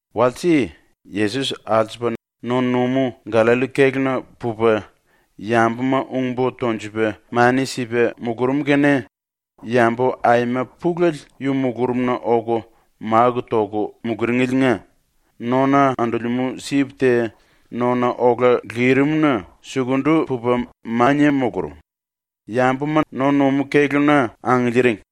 Walse Yesos alsupa no-numú ⸤Gallalli⸥ kéluna pupa yambuma ung-bo tonjupa mani sipa mulurum kene yambu aima pulele yu mulurumna oku máku toku muluringeliinga nona andolemú sip te nona ola lirim-na sukundu pupa mania mulurum, yambuma no-numú kéluna angiliiring.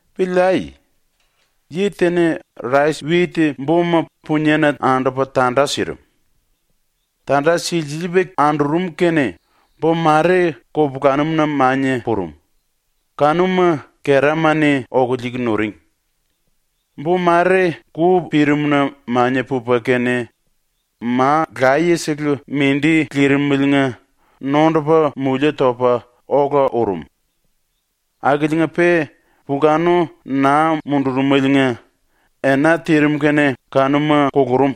“Piliai. “Yi te-ni rais-wit boma puniena andupa tanda sirim. Tanda silsiliipa andurum kene bo mare kupulanum-na mania purum, kanuma kerama-ni oku liiku nuring. Bo mare ku pirimna mania pupa kene ma laye-sele mindi lirimeliinga nondupa mulie topa ola urum. Akiliinga-pe pulkanu naa mundurumeliinga ena tirim kene kanuma kulurum.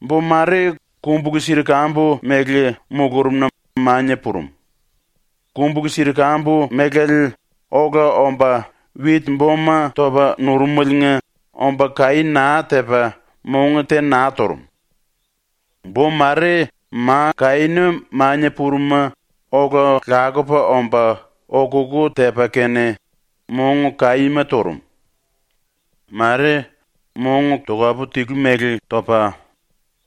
Bo mare kumbulu-sirkambu mele mulurumna mania purum, kumbulu-sirkambu melale ola omba wit-boma topa nurumeliinga omba kaí naa tepa mong te naa turum. Bo mare ma kaína mania purum-ma ola lakupa omba okukú tepa kene mong kaíma turum. Mare mong tokapu-tilu mele topa,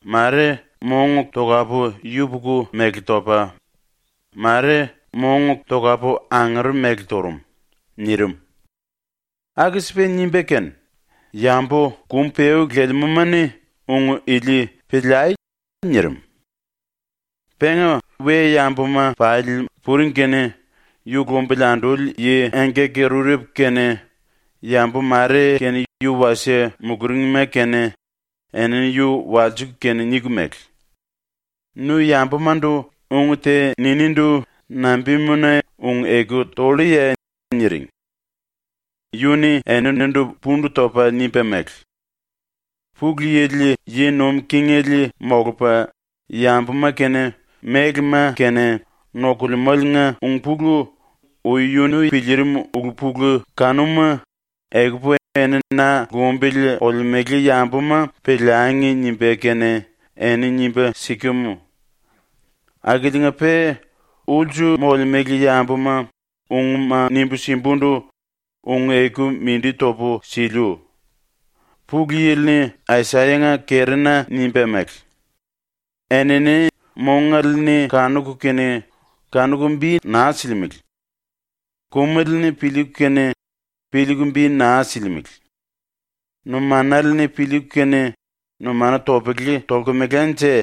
mare mong tokapu-yupuku mele topa, mare tokapu-angere mele turum.” ⸤nirim.⸥ Aku-sipa nimba kene “Yambu kum-peú lelemúma-ni ung ili piliai.” nirim. Penga we-yambuma pali puring kene yu lumbili anduli yi engkaki-rurepu kene yambu mare kene yu-wasie muluringma kene, enini yu walsiku kene niku mele: “Nu yambumandu ung te niníndu nambimuna ung-eku tolluye?” niring. Yu-ni eninindu pundu topa nimba mele: “Pulu Yili yi nuim kingele molupa yambuma kene mélema kene nokulemáliinga ulu-pulu ui yunu piliirim ulu-pulu kanuma ‘Ekupu eni ⸤na lumbili olemele yambuma⸥ piliangi.’ nimba kene eni nimba sikem. Akiliinga-pe ulsu molemele yambuma ungma nimbu simbundu ung-eku mindi topu siliu. ⸤Pulu Yili-ni Asayanga kerina nimba mele:⸥ ‘Enini mongale-ni kanuku kene kanuku bi naa silimele; kumele-ni piliiku kene piliiku bi naa silimele. Numanale-ni piliiku kene numanu topele tolkemelanje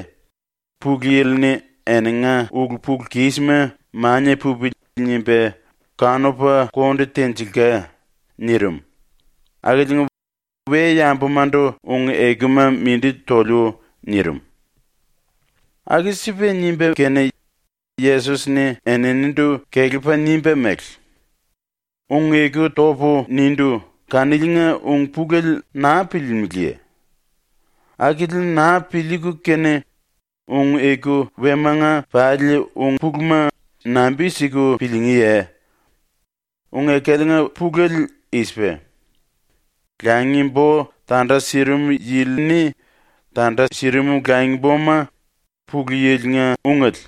⸤Pulu Yili-ni⸥ eninga ulu-pulu-kisma ‘Mania pupili.’ nimba kanupa konde tenjilka.’ ⸤nirim⸥ akiliinga we-yambumandu ung-ekuma mindi toliu.” nirim. Aku-sipa nimba kene Yesos-ni eninindu kelepa nimba mele: “Ung-eku topu nindu kaniliinga ung-pulele naa piliilimiliye? Akili naa piliiku kene ung-eku wemanga pali ung-puluma nambi-siku piliingíye? ⸤Ung-ekaliinga pulele i-sipa:⸥ Langi-bo tanda sirim yili-ni tanda sirim langi-boma ⸤Pulu Yili-nga⸥ ungele.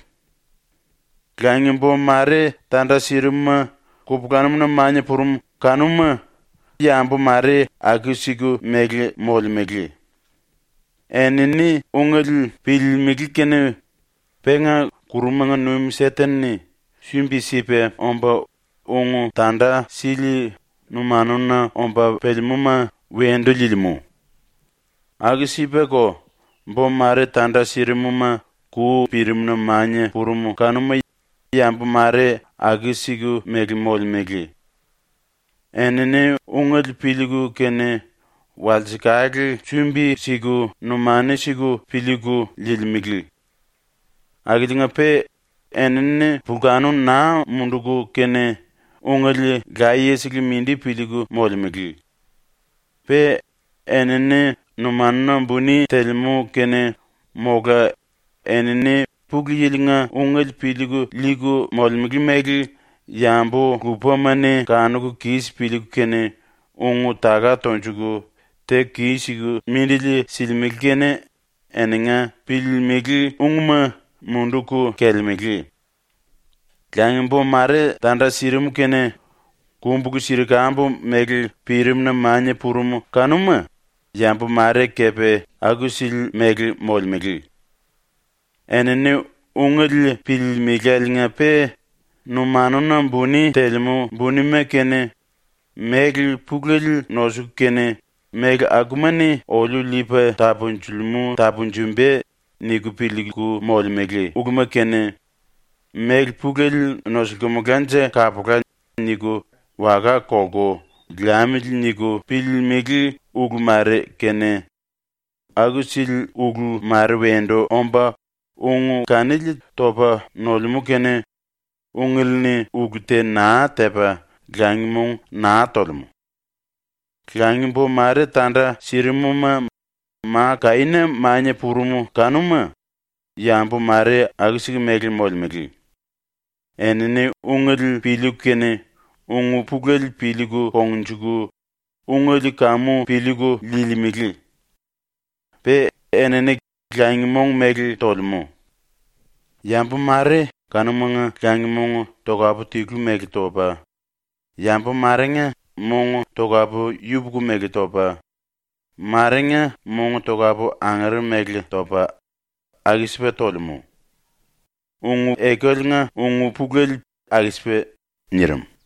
Langi-bo mare tanda sirim-ma kupulanum-na mania purum kanuma yambu mare aku-siku mele molemele. Enini ungele piliilimili kene penga ⸤kurumanga nuim⸥ Seten-ni sumbi-sipa omba ung tanda sili numanuna omba pelemúma wendu liilimú. Aku-sipako, bo mare tanda sirim-ma ku pirimna mania purum kanuma yambu mare aku-siku mele molemele. Enini ungele piliiku kene walsekale sumbi-siku numanu siku piliiku liilimele. Akiliinga-pe enini pulkanu naa munduku kene ungele layesele mindi piliiku molemele. Pe enini numanuna buni telemú kene, mola enini ⸤Pulu Yili-nga⸥ ungele piliiku liiku molemele mele yambu lupama-ni kanuku kis piliiku kene ung-taka tonjuku teku kis-siku mindili silimele kene eninga piliilimili ungma munduku kelelemele. Langi-bo mare tanda sirim kene kumbulu-sirkambu mele pirimna mania purum kanuma, yambu mare kepe aku-sili mele molemele. Enini ungele piliilimiláliinga-pe numanuna buni telemú bunima kene, méle pulele nosuku kene ‘Méle akuma-ni oliu liipa tapunjilimú tapunjumba.’ niku piliiku molemele uluma kene, ‘Méle pulele nosulkumulánje kapula.’ niku waka kolku ‘liamili.’ niku piliiku ulu mare kene, aku-sili ulu mare wendu omba ung kanili topa nolemú kene ungele-ni ulu te naa tepa langi mong naa tolemú. Langi-bo mare tanda sirim-ma ma kaína mania purum kanuma, yambu mare aku-siku mele molemele. Enini ungele piliiku kene ung-pulele piliiku kongnjuku ungele kamu piliiku liilimele. Pe enini langi-mong mele tolemele. Yambu mare kanumanga langi-mong tokapu-tilu mele topa, yambu marenga mong tokapu-yupuku mele topa, marenga mong tokapu-angere mele topa, aku-sipa tolemú. ⸤Ung-ekaliinga ung-pulele aku-sipa.” nirim.⸥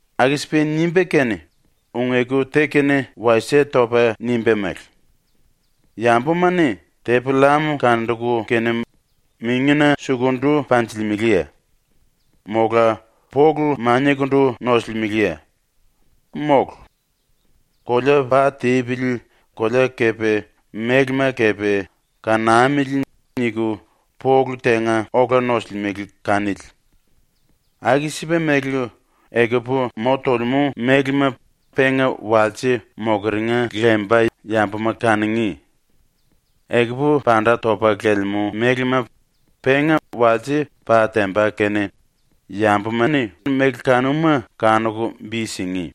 ⸤Aku-sipa nimba kene ung-eku te kene wasie topa⸥ nimba mele: “Yambuma-ni tepi-llam kanduku kene mingina sukundu panjilimeleye? Mola polu maniakundu nosulimeleye? ⸤Mólu. ‘Kolea pa tipili, kolea kepe mélema kepe kanamili.’ niku⸥ polu tenga ola nosulimele kanili. Aku-sipa mele, ekupu mo tolemú mélema penga walse mokeringa lemba yambuma kanungí; ekupu panda topa lelemú mélema penga walse ⸤pa temba kene⸥ yambuma-ni méle kanuma kanuku bi singí.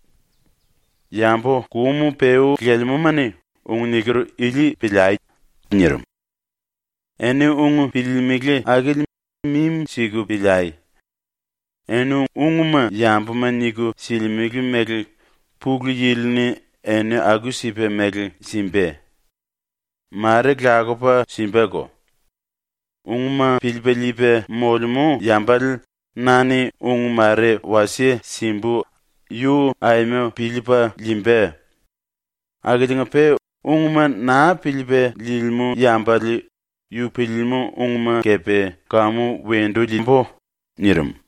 Yambu kum-peú lelemúma-ni ⸤ung niker ili⸥ piliai.” ⸤nirim.⸥ “Eni ung piliilimili akili mimi-siku piliai. Eni ⸤ung⸥ma yambuma niku silimele mele ⸤Pulu Yili-ni⸥ eni aku-sipa mele simba. Mare lakupa simbako. ⸤Ung⸥ ma piliipa liipa molemú yambale na-ni ⸤ung⸥ mare wasie simbu, yu aima piliipa liimba. Akiliinga-pe ⸤ung⸥ ma naa piliipa liilimú yambale yu piliilimú ⸤ung⸥ma kepe kamu wendu liimbu.” nirim.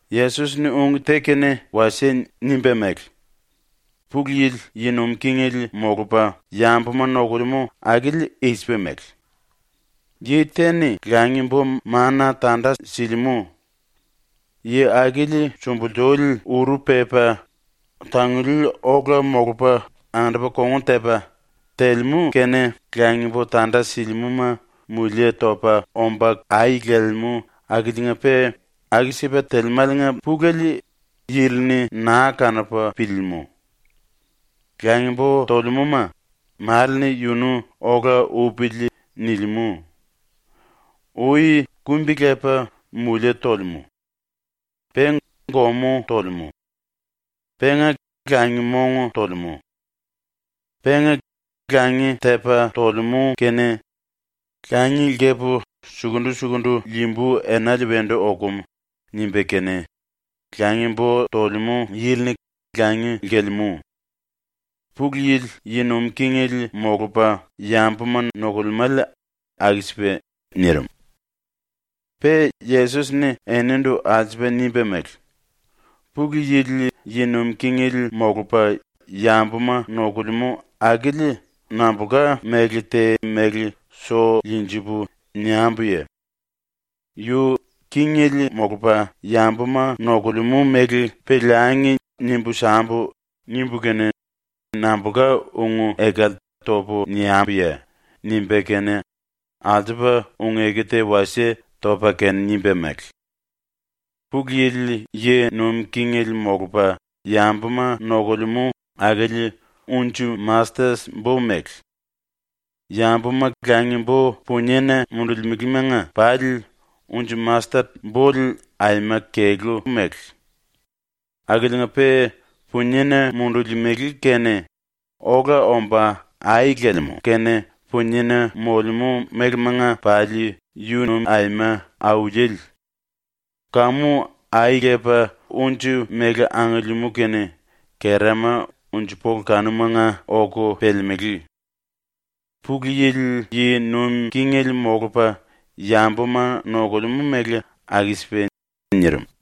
Yesos-ni ung te kene wasie nimba mele: “Pulu Yili yi nuim kingele molupa yambuma nokulemú akili i-sipa mele: “Yi te-ni langi-bo mana tanda silimú. Yi akili sumbulsuli uru pepa, tanguli ola molupa ⸤andupa kongun tepa⸥, telemú kene langi-bo tanda silimúma mulie topa omba ai lelemú akiliinga-pe aku-sipa telemáliinga pulele yili-ni naa kanupa piliilimú. Langi-bo tolemúma male-ni yunu ‘ola upili.’ nilimú. Ui kumbi-lepa mulie tolemú. Pe gomú tolemú. Penga langi-mong tolemú. Penga langi tepa tolemú kene ‘Langi lkepu sukundu-sukundu liimbu enale wendu okum.’ nimba kene langi-bo tolemú yili-ni langi lkelemú. ⸤Pulu Yili yi nuim kingele molupa yambuma nokulemále aku-sipa.⸥” nirim. Pe Yesos-ni eninindu alsupa nimba mele: “Pulu Yili yi nuim kingele molupa yambuma nokulemú akili nambulka méle te mele so liinjipu niambuye? ‘Yu kingele molupa yambuma nokulemú mele piliangi nimbu sambu.’ nimbu kene nambulka ung-ekale topu niambuye?” ⸤nimba kene, alsupa ung-eku te wasie topa kene nimba mele:⸥ “⸤Pulu Yili yi nuim kingele molupa yambuma nokulemú⸥ akili unji-mastet bo mele. Yambuma langi-bo puniena mundulimelemanga pali unji-mastet bole aima kelú wallú mele. Akiliinga-pe puniena mundulimele kene ola omba ai lelemú kene puniena molemú mélemanga pali yunu aima auliele. Kamu ai lepa unji mele angiliimú kene kerama unji-pola kanumanga oku pelemelé. ⸤Pulu Yili yi nuim kingele molupa yambuma nokulemú mele aku-sipa⸥.” nirim.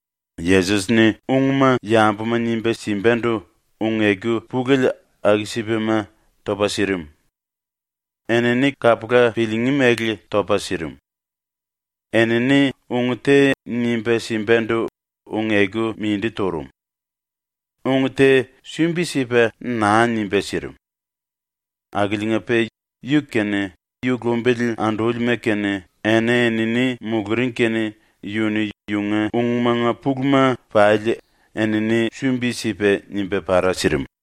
Yesos-ni ungma yambuma nimba simbandu ung-eku pulele aku-sipama topa sirim. Enini kapula piliingí mele topa sirim. Enini ung te nimba simbandu ung-eku mindi turum. ⸤Ung te sumbi-sipa naa nimba sirim.⸥ Akiliinga-pe yu kene yu lumbili andúlima kene eni-enini muluring kene yu-ni yunga ungmanga puluma pali enini sumbi-sipa nimba para sirim.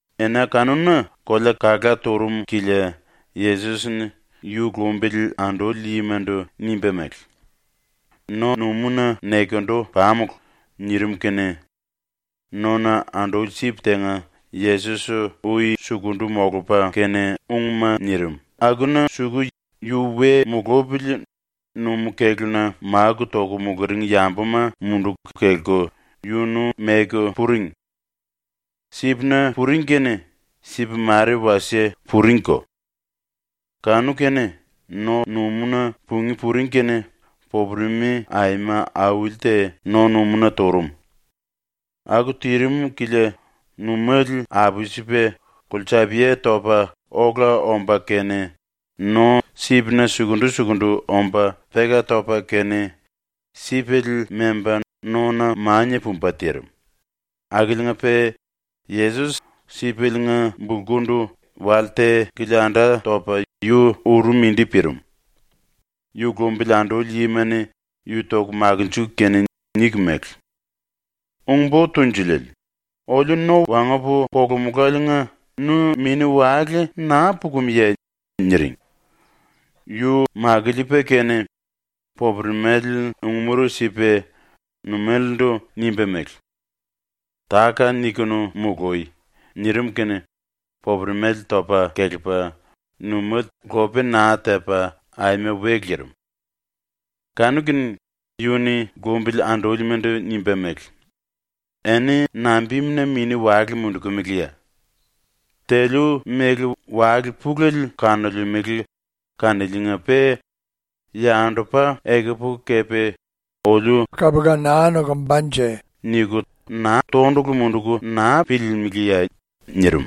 Ena kanuna kolea kalá turum kilia Yesos-ni yu lumbili anduli yimandu nimba mele: “No-numúna nekendu pamulu.” nirim kene nona anduli sip tenga Yesos ui sukundu molupa kene ungma nirim akuna suku yu we mulupili numú-kéluna máku toku muluring yambuma munduku kelku yunu meku puring. Sipna puring kene sip mare wasie puringko. Kanu-kene, ⸤no-numúna pungí puring kene⸥ popuremi aima auli te no-numúna turum. Aku tirim kilia numéle apsipa kolsapia topa ola omba kene no sipna sukundu-sukundu omba peka topa kene sipele memba nona mania pumba tirim, akiliinga-pe Yesos sipeliinga bulkundu wale te kilianda topa we uru mindi pirim. Yu lumbili anduli yima-ni yu toku makinjiku kene niku mele: “Ung-Bo Tunjuliele, oliu no wangupu kolumuláliinga nu mini-wale naa pukumuye?” niring. Yu makiliipa kene popuremale ung-mura sipa numelendu nimba mele: “Táka-nikunu mului!” nirim kene popuremale topa kelepa numéle lope naa tepa aima we lirim. Kanu-kene yu-ni lumbili andúlimandu nimba mele: “Eni nambimuna mini-wale mundukumiliye? ⸤Teliu mele wale pulele kanolemele kaniliinga-pe⸥ yandupa ekupu kepe ‘Oliu nokumba.’ niku tondulu munduku naa piliilimiliye?” nirim.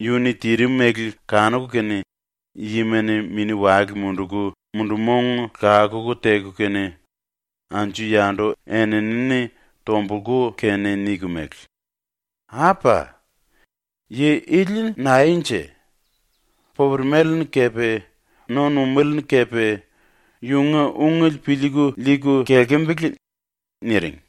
⸤Yu-ni tirim mele kanuku kene⸥ yima-ni mini-wale munduku mundu-mong lakuku teku kene anju-yandu eni-enini tombulku kene niku mele: “Apa! Yi ili naenje? Popuremale-ni kepe no-numéle-ni kepe yunga ungele piliiku liiku kelkembele.” niring.